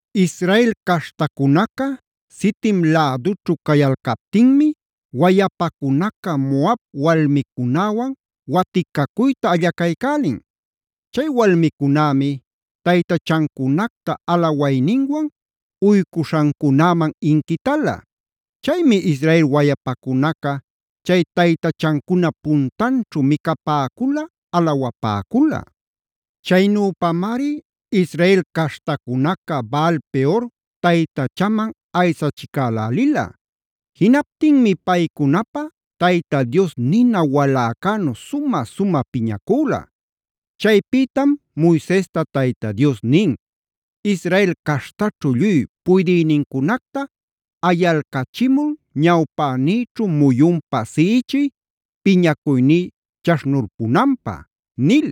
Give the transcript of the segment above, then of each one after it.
Israel caśhtacunaca Sitim lädućhu cayalcaptinmi wayapacunaca Moab walmicunäwan waticacuyta allacaycälin. Chay walmicunämi taytachancunacta alawayninwan uycuśhancunäman inquitala. Chaymi Israel wayapacunaca chay taytachancunap puntanćhu micapäcula, alawapäcula. Chaynüpamari Israel caśhtacunaca Baal-peora taytachaman aysachicälälila. Jinaptinmi paycunapä Tayta Dios nina waläcänu sumä-sumä piñacüla. Chaypïtam Moisesta Tayta Dios nin: “Israel caśhtaćhu lluy puydïnincunacta ayalcachimul ñawpänïćhu muyunpa siꞌichiy piñacuyní chaśhnulpunanpä” nil.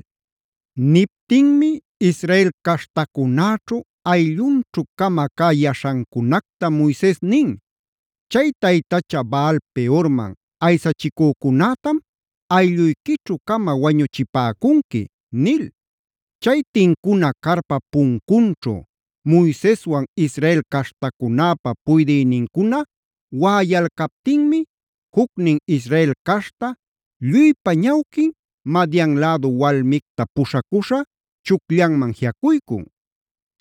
Niptinmi Israel caśhtacunäćhu ayllunćhu-cama cä yaśhancunacta Moises nin: “Chay taytacha Baal-peorman aysachicücunätam aylluyquićhu-cama wañuchipäcunqui” nil. Chay tincuna carpap puncunćhu Moiseswan Israel caśhtacunäpä puydïnincuna waꞌayalcaptinmi jucnin Israel caśhta lluypa ñawquin Madian lädu walmicta puśhacuśha chucllanman jiꞌacuycun.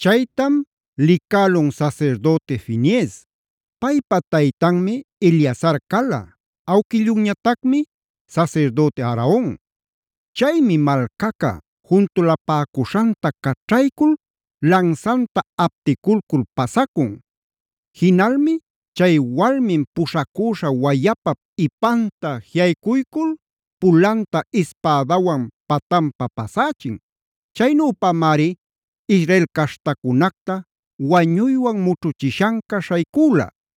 Chaytam licälun sasirdüti Finees; paypa taytanmi Eleazar cala, awquillunñatacmi sasirdüti Aaron. Chaymi malcaca juntulapäcuśhanta caćhaycul lansanta apticulcul pasacun. Jinalmi chay walmin puśhacüśha wayapap ipanta jiꞌaycuycul pulanta ispädawan patanpa pasächin. Chaynüpamari Israel caśhtacunacta wañuywan mućhuchishanca śhaycüla.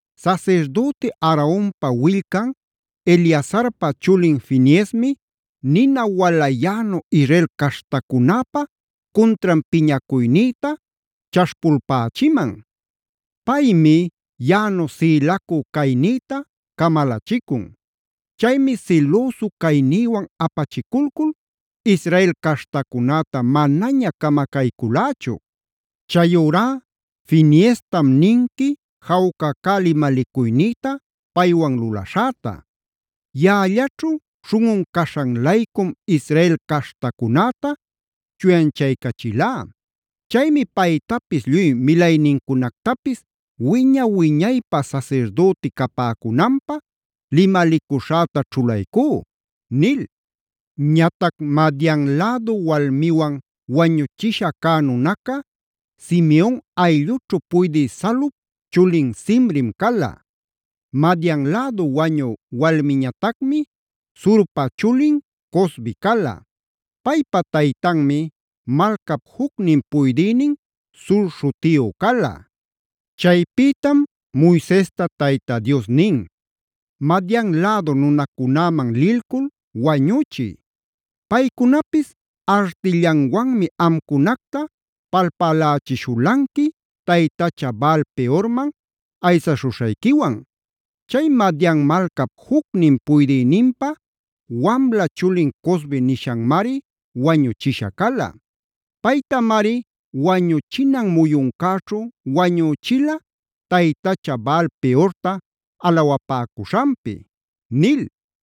“Sasirdüti Aaronpa willcan, Eleazarpa chulin Fineesmi nina walayänu Israel caśhtacunäpa cuntran piñacuynïta chaśhpulpächiman. Paymi yaꞌanu sïlacu caynïta camalachicun. Chaymi silüsu caynïwan apachiculcul Israel caśhtacunäta manaña camacaycülächu. Chayurá Fineestam ninqui jawca cä limalicuynïta paywan lulaśhäta. Yaꞌallaćhu śhunꞌun caśhan-laycum Israel caśhtacunäta chuyanchaycachilá. Chaymi paytapis lluy milaynincunactapis wiña-wiñaypä sasirdüti capäcunanpä limalicuśhäta ćhulaycú”b nil. Ñatac Madian lädu walmiwan wañuchisha cä nunaca, Simeon ayllućhu puydï Salup chulin Zimrim cala. Madian lädu wañü walmiñatacmi Zurpa chulin Cozbi cala. Paypa taytanmi malcap jucnin puydïnin Zur śhutiyu cala. Chaypïtam Moisesta Tayta Dios nin: “Madian lädu nunacunäman lilcul wañüchiy. Paycunapis artillanwanmi amcunacta palpälälichishulanqui, taytacha Baal-peorman aysaśhuśhayquiwan. Chay Madian malcap jucnin puydïninpä wamla chulin Cozbi nishanmari wañuchisha cala. Paytamari wañuchinan muyuncäćhu wañüchila taytacha Baal-peorta alawapäcuśhanpi” nil.